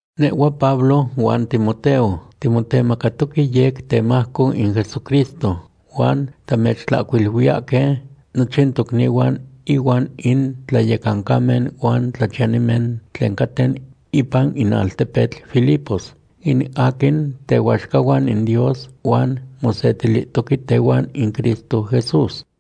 Nehhua Pablo huan Timoteo, timotemacatoque yec temajco in Jesucristo, huan tamechtlahcuiluiyahque nochin tocnihuan inuan in tlayecancamen huan tlachiyanimen tlen caten ipan in altepetl Filipos, in aquin tehuaxcahuan in Dios huan mosetilihtoque tehuan in Cristo Jesús.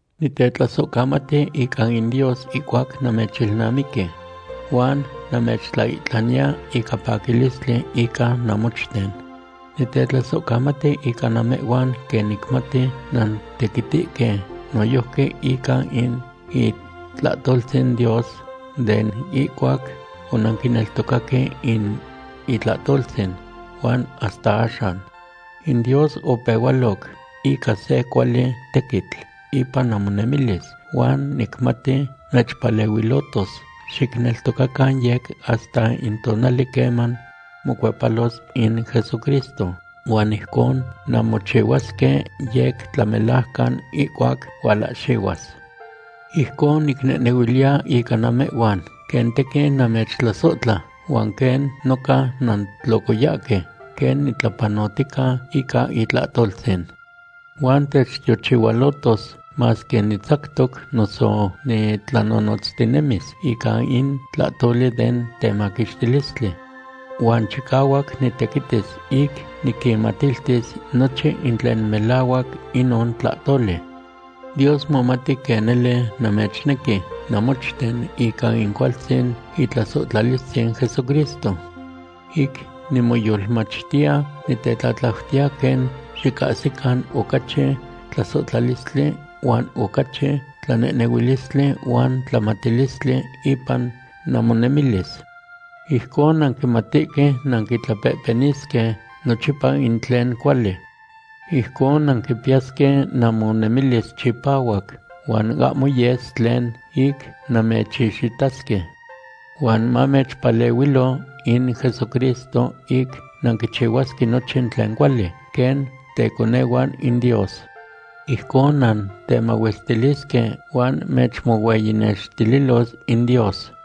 Nitetlasohcamati ica in Dios ihcuac namechilnamiqui. Huan namechtlaihtlaniya ica paquilistli ica namochten. Nitetlasohcamati ica namehhuan quen nicmati nantequitihque noyojqui ica in itlahtoltzin Dios den ihcuac onanquineltocaque in itlahtoltzin huan hasta axan. In Dios opehualoc ica se cuali tequitl ipan namonemilis huan nicmati mechpalehuilotos xicneltocacan yec hasta in tonali queman mocuepalos in Jesucristo, huan ijcon nanmochihuasque yec tlamelajcan ihcuac hualahxihuas. Ijcon nicnehnehuiliya ica namehhuan quen tequin namechtlasohtla, huan quen noca nantlocoyahque quen nitlapanotica ica itlahtoltzin. Huan techtiochihualohtos masque nitzactos, noso nitlanonotztinemis ica in tlahtoli den temaquixtilistli. Huan chicahuac nitequitis ic niquinmatiltis nochin in tlen melahuac inon tlahtoli. Dios momati quen nele namechnequi namochten ica in cualtzin itlasohtlalistzin Jesucristo. Ic nimoyolmachtiya, nitetlatlautiya quen xicahsican ocachi tlasohtlalistli huan ocachi tlanehnehuilistli huan tlamatilistli ipan namonemilis. Ijcon nanquimatihque nanquitlapehpenisque nochipa in tlen cuali. Ijcon nanquipiyasque namonemilis chipahuac huan ahmo yes tlen ic namechixitasque. Huan mamechpalehuilo in Jesucristo ic nanquichihuasque nochin tlen cuali, quen teconehuan in Dios. Ijcon nantemahuestilisque huan mechmohueyinextililos in Dios.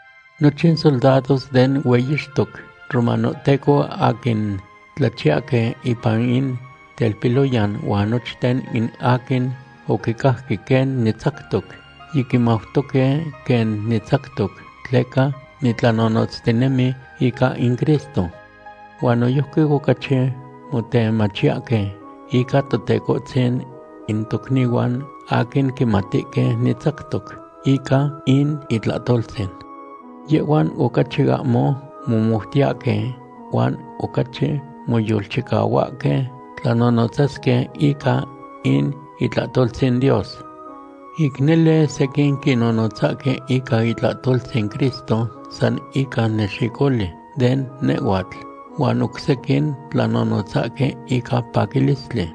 Nochin soldados den hueyixtoc romanohteco aquin tlachiyahque ipan in telpiloyan huan nochten in aquin oquicajque quen nitzactoc yiquimautoque quen nitzactoc tleca nitlanonotztinemi ica in Cristo. Huan noyojqui ocachi motemachiyahque ican Totecohtzin in tocnihuan aquin quimatihque nitzactoc ica in itlahtoltzin. Yehhuan ocachi ahmo momoutiyahque huan ocachi moyolchicahuahque tlanonotzasque ica in itlahtoltzin Dios. Ic nele sequin quinonotzahque ica itlahtoltzin Cristo san ica nexicoli de nehhuatl, huan oc sequin tlanonotzahque ica paquilistli.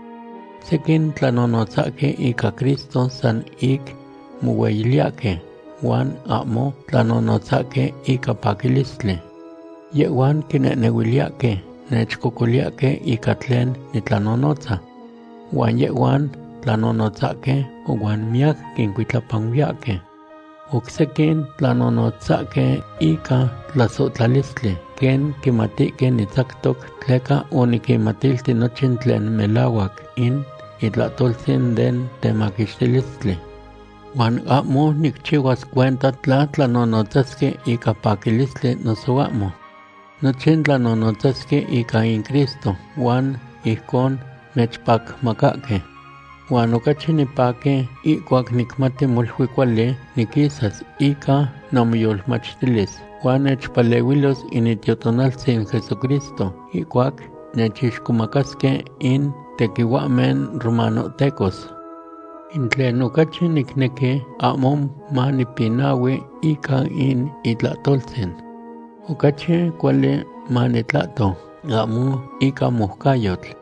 Sequin tlanonotzahque ica Cristo san ic mohueyiliyahque huan ahmo tlanonotzahque ica paquilistli. Yehhuan quinehnehuiliyahque nechcocoliyahque ica tlen nitlanonotza. Huan yehhuan tlanonotzahque huan miyac quincuitlapanuiyahque. Oc sequin tlanonotzahque ica tlasohtlalistli quen quimatihque nitzactoc tleca oniquinmatilti nochin tlen melahuac in itlahtoltzin den temaquixtilistli. Huan ahmo nicchihuas cuenta tla tlanonotzasque ica paquilistli noso ahmo. Nochin tlanonotzasque ica in Cristo huan ijcon nechpacmacahque. Huan ocachi nipaqui ihcuac nicmati molui cuali niquisas ica namoyolmachtilis, huan nechpalehuilos in Itiotonaltzin Jesucristo ihcuac nechixcomacasque in tequihuahmen romanohtecos. In tlen ocachi nicnequi ahmo manipinahui ica in itlahtoltzin. Ocachi cuali manitlahto ahmo ica moucayotl.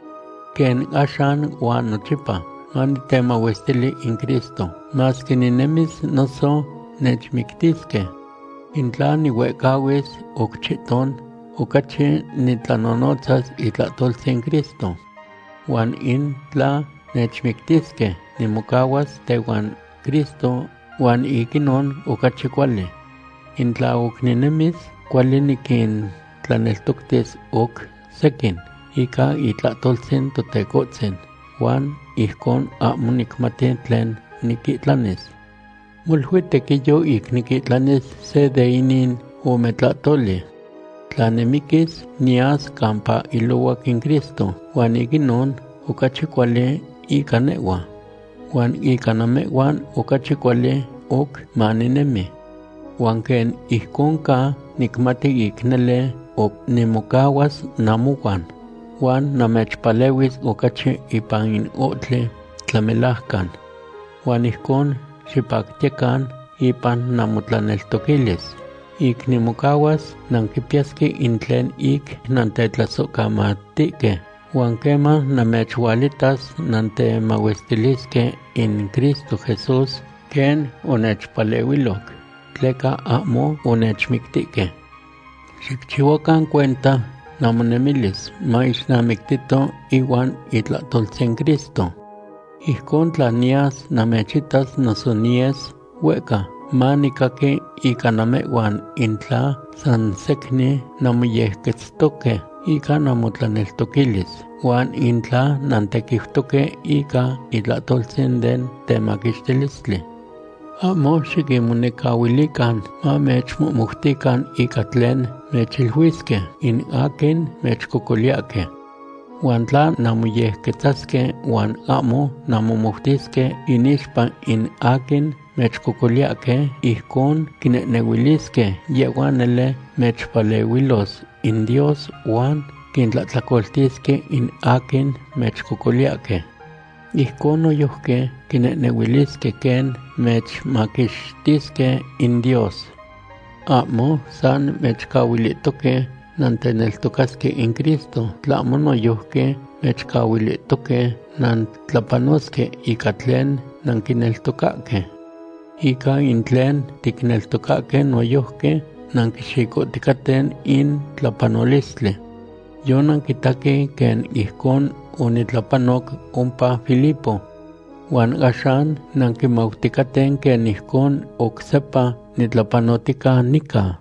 Quen axan huan nochipa manitemahuestili in Cristo, masque ninemis noso nechmictisque. In tla nihuehcahuis oc chihton, ocachi nitlanonotzas itlahtoltzin Cristo. Huan in tla nechmictisque, nimocahuas tehuan Cristo huan ic inon ocachi cuali. In tla oc ninemis, cuali niquintlaneltoctis oc sequin ica itlahtoltzin Totecohtzin, huan ijcon ahmo nicmati tlen niquihtlanis. Molui tequiyo ic niquihtlanis se de inin ome tlahtoli. Tla nimiquis, niyas campa ilohuac in Cristo, huan ic inon ocachi cuali ica nehhua. Huan ica namehhuan ocachi cuali oc maninemi. Huan quen ijcon ca, nicmati ic nele oc nimocahuas namohuan huan namechpalehuis ocachi ipan in ohtli tlamelajcan. Huan ijcon xipactiyecan ipan namotlaneltoquilis. Ic nimocahuas, nanquipiyasque in tlen ic nantetlasohcamatihque, huan queman namechualitas nantemahuestilisque in Cristo Jesús quen onechpalehuiloc, tleca ahmo onechmictihque. Xicchihuacan cuenta namonemilis maixnamictito ihuan itlahtoltzin Cristo. Ijcon tla niyas namechitas noso niyes huehca, manicaqui ica namehhuan in tla san secnin nanmoyequetztoque ica namotlaneltoquilis, huan in tla nantequiutoque ica itlahtoltzin den temaquixtilistli. Ahmo xiquinmonecahuilican mamechmohmoutican ica tlen mechchihuilisque in aquin mechcocoliyahque. Huan tla nanmoyequetzasque huan ahmo nanmomoutisque inixpa in aquin mechcocoliyahque, ijcon quinehnehuilisque yehhuan nele mechpalehuilos in Dios huan quintlahtlacoltisque in aquin mechcocoliyahque. Ijcon noyojqui quinehnehuilisque quen mechmaquixtisque in Dios. Ahmo san mechcahuilihtoque nanteneltocasque in Cristo, tlahmo noyojqui mechcahuilihtoque nantlapanosque ica tlen nanquineltocahque. Ica in tlen ticneltocahque noyojqui nanquixicoticaten in tlapanolistli. Yonanquitaque quen ijcon onitlapanoc ompa Filipo. Huan axan nanquimauticaten quen ijcon oc sepa nitlapanotica nica.